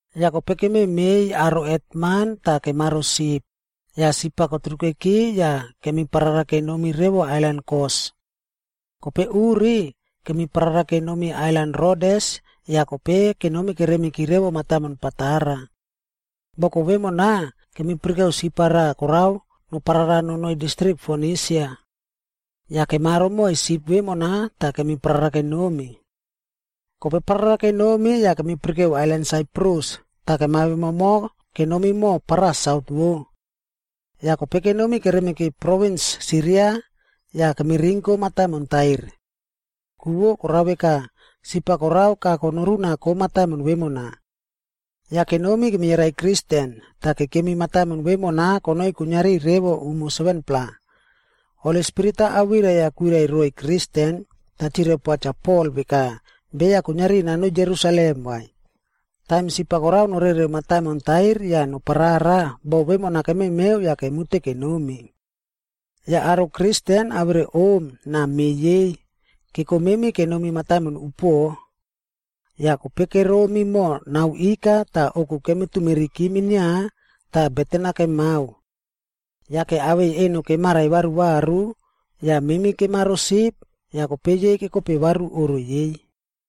Yah kope kememeiy aro hetman tah kemaro sip, yah sip-a koturukeki yah kemi parara kenomi revo ailan Kos. Kope uri, kemiparara kenomi ailan Rodes yah kope kenomi keremiki revo mataimon Patara. Boko vemona, kemipirikeu sip-a raꞌa korao noparara nonoi distrik Fonisia. Yah kemaro moiy sip vemona tah kemiparara kenomi. Kope parara kenomi yah kemipirikeu ailan Saiprus, tah kemawemomo kenomi moho paraꞌa saut vo. Yah kope kenomi keremiki provins Siria yah kemirinko mataimon Tair. Ku vo korao veka, sip-a korao kago norunako mataimon vemona. Yah kenomi kemiyarai Kristen, tah kekemi mataimon vemona konoi kuiniari revo umo 7-pla. Holi Spirit-a awirai-a kwirai roiy Kristen, tah chirai poa Cha Pol veka beya kuiniari nanoi Jerusalem vai. Taim sip-a korao norereu mataimon Tair yah noparara, bo vemona kememeu yah kemute kenomi. Yah aro Kristen awere om na me yei, kekomemi kenomi mataimon upuoꞌo. Yah kope, keromi moho nao ika tah ouku kemitumeriki minia tah beten-a kemao. Yake awei eno kemarai varuvaru, yah memi kemaro sip yah kope yei kekope varu oꞌro yei.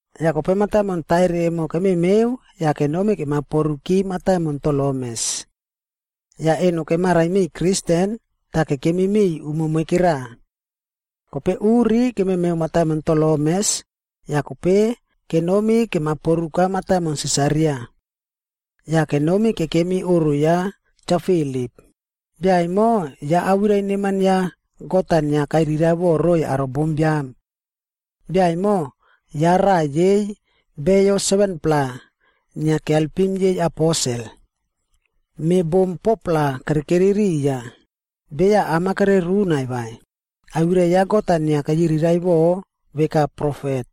Yah kope mataimon Tair emo kememeu yah kenomi kemaporuki mataimon Tolemes. Yah eno kemarai miꞌiy Kristen, tah kekemi miꞌiy umo moikera. Kope uri kememeu mataimon Tolemes, yah kope kenomi kemaporuka mataimon Sisaria. Yah kenomi kekemi oꞌro ya Cha Filip, bia emo ya awirai neman ya God-a inia kairiraiꞌvo roiy aro bombiam. Bia emo, ya raꞌa yei beya 7-plaa inia kialpim yei aposel. Me bom 4-pla kerekeri riya, beya am-a kererunaiy vai, awirai ya God-a inia keyiriraiꞌvo veka profet.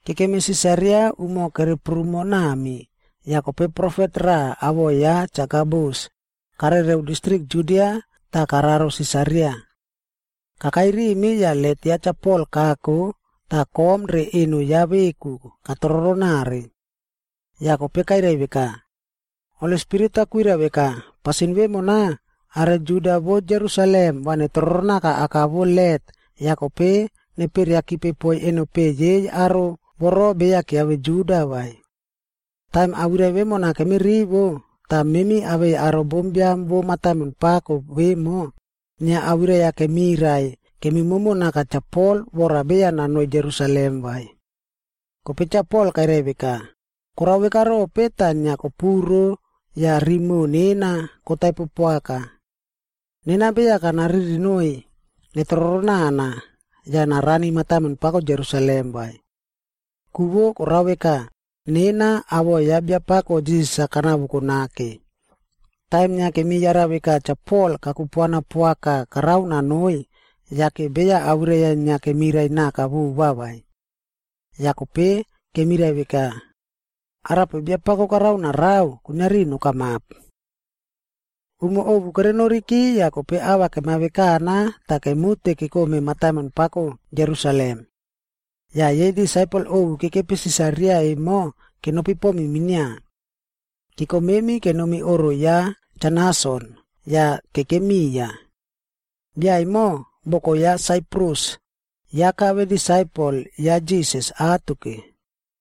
Kekemi Sisaria umo kereprumo nami, yah kope profet raꞌa awoꞌo ya Cha Agabus, karereu distrik Judia tah kararo Sisaria. Kakai rimi yah let ya Cha Pol kako tah kom re eno ya veku katroronare. Yah kope kairai veka, “Holi Spirit-a kwirai veka, ‘Pasin vemona, aro Juda vo Jerusalem va netroronaka aka vo let yah kope neperiakipe poiy enopeꞌe yei aro voro beya kiave Juda vai.’” Taim awirai vemona kemirivo, tah memi awei aro bombiam vo mataimon pako vemo, inia awirai-a kemirai kemimomo naka Cha Pol vora beya nanoi Jerusalem vai. Kope Cha Pol kairai veka, “Korao veka rope tah inia kopuro yah rimoꞌo nena kotaipo poaka? Nena beya kanaririnoiy netroronana, yah narani mataimon pako Jerusalem vai. Ku vo korao veka nena awoꞌo ya Biapako Jisas-a kanavoko nake.” Taim inia kemiyara veka Cha Pol kakupuana poaka karao nonoi, yake beya awirai-a inia kemirai naka vova vai. Yah kope kemirai veka, “Arape Biapako karao narao, kuiniari nokamap.” Umo ovu kerenoriki yah kope ava kemavekana tah kemute kekome mataimon pako Jerusalem. Yah yei disaipel ovu kekepi Sisaria emo kenopi pomi minia. Keko memi kenomi oꞌro ya Cha Nason, yah kekemi miya. Bia emo, boko ya Saiprus, ya kave disaipel ya Jisas atoke.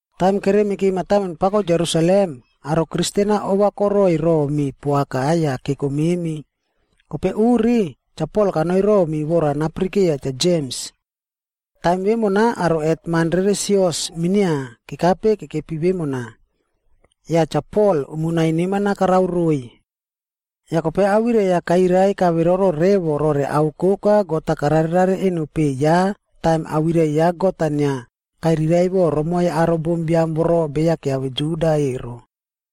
Taim keremiki mataimon pako Jerusalem, aro Kristen-a ovakoroi romi poaka yah keko memi. Kope uri, Cha Pol kanoi romi vora napirikeiya Cha Jems. Taim vemona aro hetman rere sios minia kekape kekepi vemona. Yah Cha Pol umonai neman-a karao roiy. Yah kope awirai-a kairai kaveroro revo rore ao koka God-a kararerare eno peꞌe ya taim awirai ya God-a inia kairiraiꞌvo romoiy aro bombiam voro beya kiave Juda ero.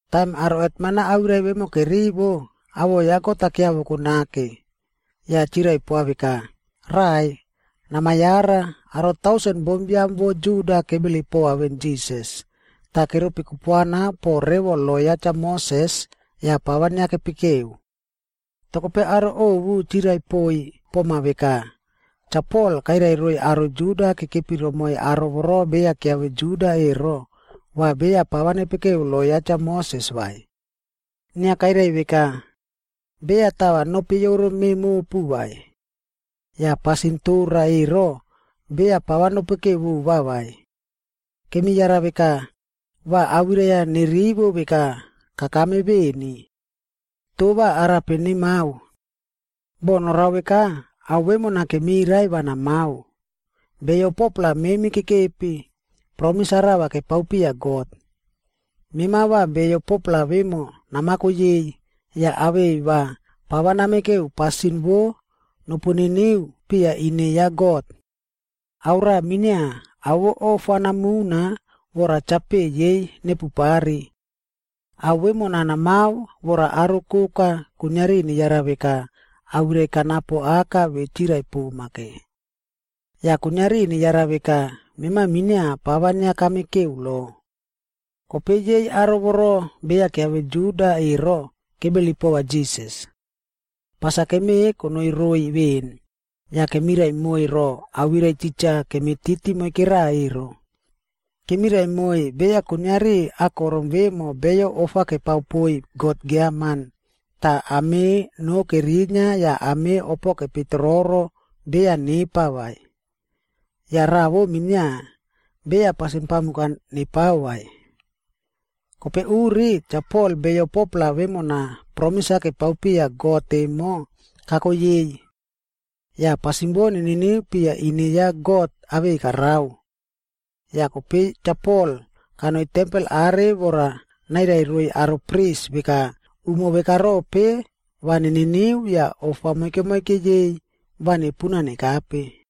Taim aro hetman-a awirai vemo kerivo, awoꞌo ya God-a kiavoko nake. Yah chirai poa veka, “Raꞌai, namayara, aro tausen bombiam vo Juda kebilip pova veꞌen Jisas, tah keropi kupuana po revo lo ya Cha Moses yah pava inia kepekeu. Toh kope aro ovu chirai poiy poma veka, ‘Cha Pol kairai roiy aro Juda kekepi romoiy aro voro beya kiave Juda ero, va beya pava nepekeu lo ya Cha Moses vai. Inia kairai veka, “Beya tava nopeiyoro me mopu vai. Yah pasin tora ero, beya pava nopekeu vova vai.” ’ Kemiyara veka, va awirai-a nerivo veka kakame veni. Toh va arape nemao? Boh norao veka, ao vemona kemirai va namao. Beyo 4-pla memi kekepi, promis-a rava kepao piya God. Mema va beyo 4-pla vemo namako yei, yah awei va pava nopekeu pasin vo nopu niniu piya ine ya God. Ao raꞌa minia, ao vo ofa namuna vora chapeꞌe yei nepupari. Ao vemona namao vora aro koka kuiniari neyara veka awirai kanapo aka ve chirai poma ke. Yah kuiniari neyara veka mema minia pava inia kamekeu lo. Kope yei aro voro beya kiave Juda ero, kebilip pova Jisas. Pas-a kemeꞌe konoi roiy veꞌen, yah kemirai moiy ro awirai titja kemititi moikera ero. Kemirai moiy beya kuiniari akorom vemo beyo ofa kepao poiy god giaman, tah ame noo kerinia yah ame opo kepeitororo beya nepa vai. Yah raꞌa vo minia, beya pasin pamuk-a nepao vai.” Kope uri, Cha Pol beyo 4-pla vemona promis-a kepao piya God emo kako yei. Yah pasin vo neniniu piya ine ya God awei karao. Yah kope Cha Pol kanoi tempel are vora nairai roiy aro pris veka umo veka rope va neniniu yah ofa moike moike yei va nepuna nekape.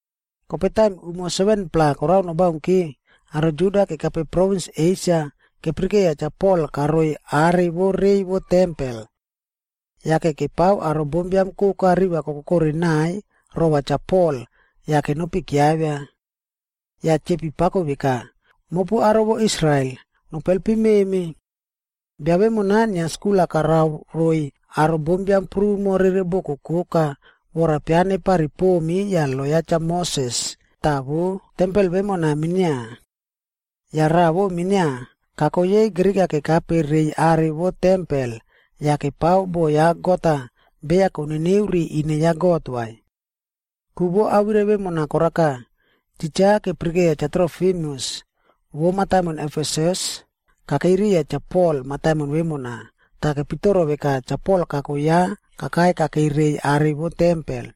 Kope taim umo 7-pla korao nobaunki, aro Juda kekape provins Esia kepirikeiya Cha Pol karoi are vo rei vo tempel. Yake kepao aro bombiam koka riva kokokore nai rova Cha Pol yah kenopi kiavia. Yah chepi pako veka, “Mopu aro vo Israel, nopu helpim memi. Bia vemona inia skul-a karao roiy aro bombiam prumo rere boko koka vora pianepari pomi yah lo ya Cha Moses tah vo tempel vemona minia. Yah raꞌa vo minia, kako yei Grik-a kekape reiy are vo tempelb yah kepao bo ya God-a beya koniniu ri ine ya God vai.” Ku vo awirai vemona koraka, titja kepirikeiya Cha Trofimusc vo mataimon Efesus kakei riya Cha Pol mataimon vemona, tah kepitoro veka Cha Pol kako ya kakai kakei rei are vo tempel.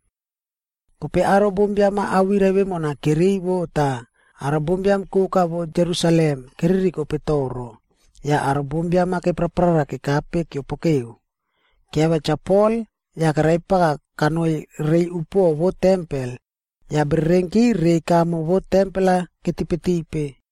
Kope aro bombiam-a awirai vemona kerivo tah aro bombiam koka vo Jerusalem keririkope toro, yah aro bombiam-a kepraprara kekape keopokeu. Kiavia Cha Pol yah keraipaka kanoi rei upuoꞌo vo tempel, yah bererenki reiy kamo vo tempel-ad ketipetipe.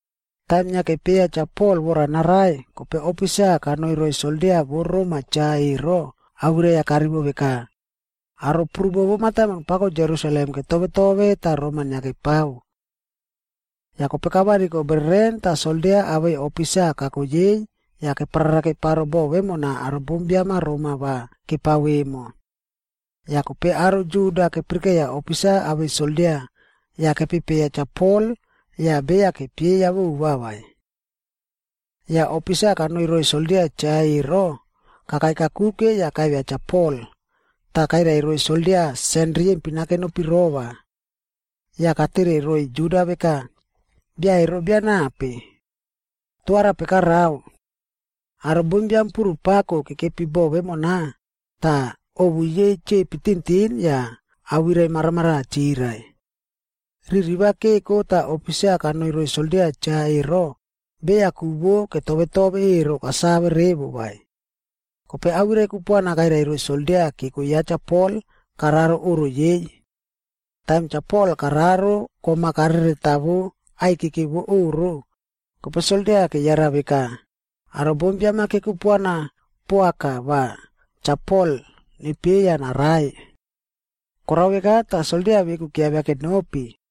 Taim inia kepieya Cha Pol vora narai, kope ofisa kanoi roiy soldia vo Rom-a cha ero, awirai-a karivo veka, “Aro prumo vo mataimon pako Jerusalem ketove tove tah roma inia kepao.” Yah kope kavariko bereren tah soldia awei ofisa kako yei yah keprara keparo bo vemona aro bombiam-a roma va kepao emo. Yah kope aro Juda kepirikeiya ofisa awei soldia, yah kepepeiya Cha Pol yah beya kepieya vova vai. Yah ofisa kanoi roiy soldia cha ero, kakai kakuke yah kavia Cha Pol, tah kairai roiy soldia sen riyempin-a kenopirova. Yah katere roiy Juda veka, “Bia ero bia nape? Toh arape karao?” Aro bombiam puru pako kekepi bo vemona, tah ovu yei chepi tintin yah awirai maramaraꞌa chirai. Riri va keko tah ofisa kanoi roiy soldia cha ero, beya ku vo ketove tove ero kasave revo vai. Kope awirai kupuana kairai roiy soldia keko ya Cha Pol kararo oꞌro yei. Taim Cha Pol kararo kom-a kareretawo aikeke vo oꞌro, kope soldia keyara veka, aro bombiam-a kekupuana poaka va Cha Pol nepieya narai. Korao veka tah soldia veku kiavia kenopi.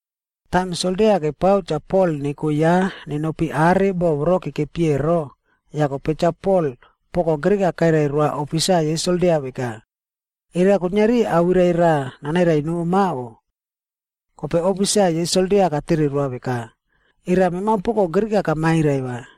Taim soldia kepao Cha Pol neko ya nenopi are boꞌo voro kekepi ero, yah kope Cha Pol poko Grik-a kairai roa ofisa yei soldia veka, “Era kuiniari awirai raꞌa nanairai noma o?” Kope ofisa yei soldia katere roa veka, “Era mema poko Grik-a kamairai vai?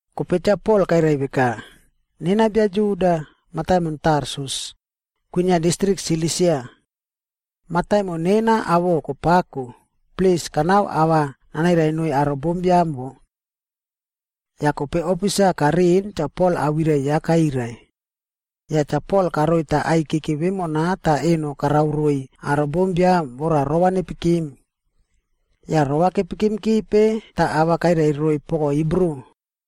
Kope Cha Pol kairai veka, “Nena bia Juda, mataimon Tarsus, kwinia distrik Silisia. Mataimon nena awoꞌo kopako, plis kanao ava nanairai noiy aro bombiam wo.” Yah kope ofisa kariꞌin Cha Pol awirai ya kairai. Yah Cha Pol karoita aikeke vemona tah eno karao roiy aro bombiam vora rova nepikim. Yah rova kepikimkipe tah ava kairai roiy poko Hibru.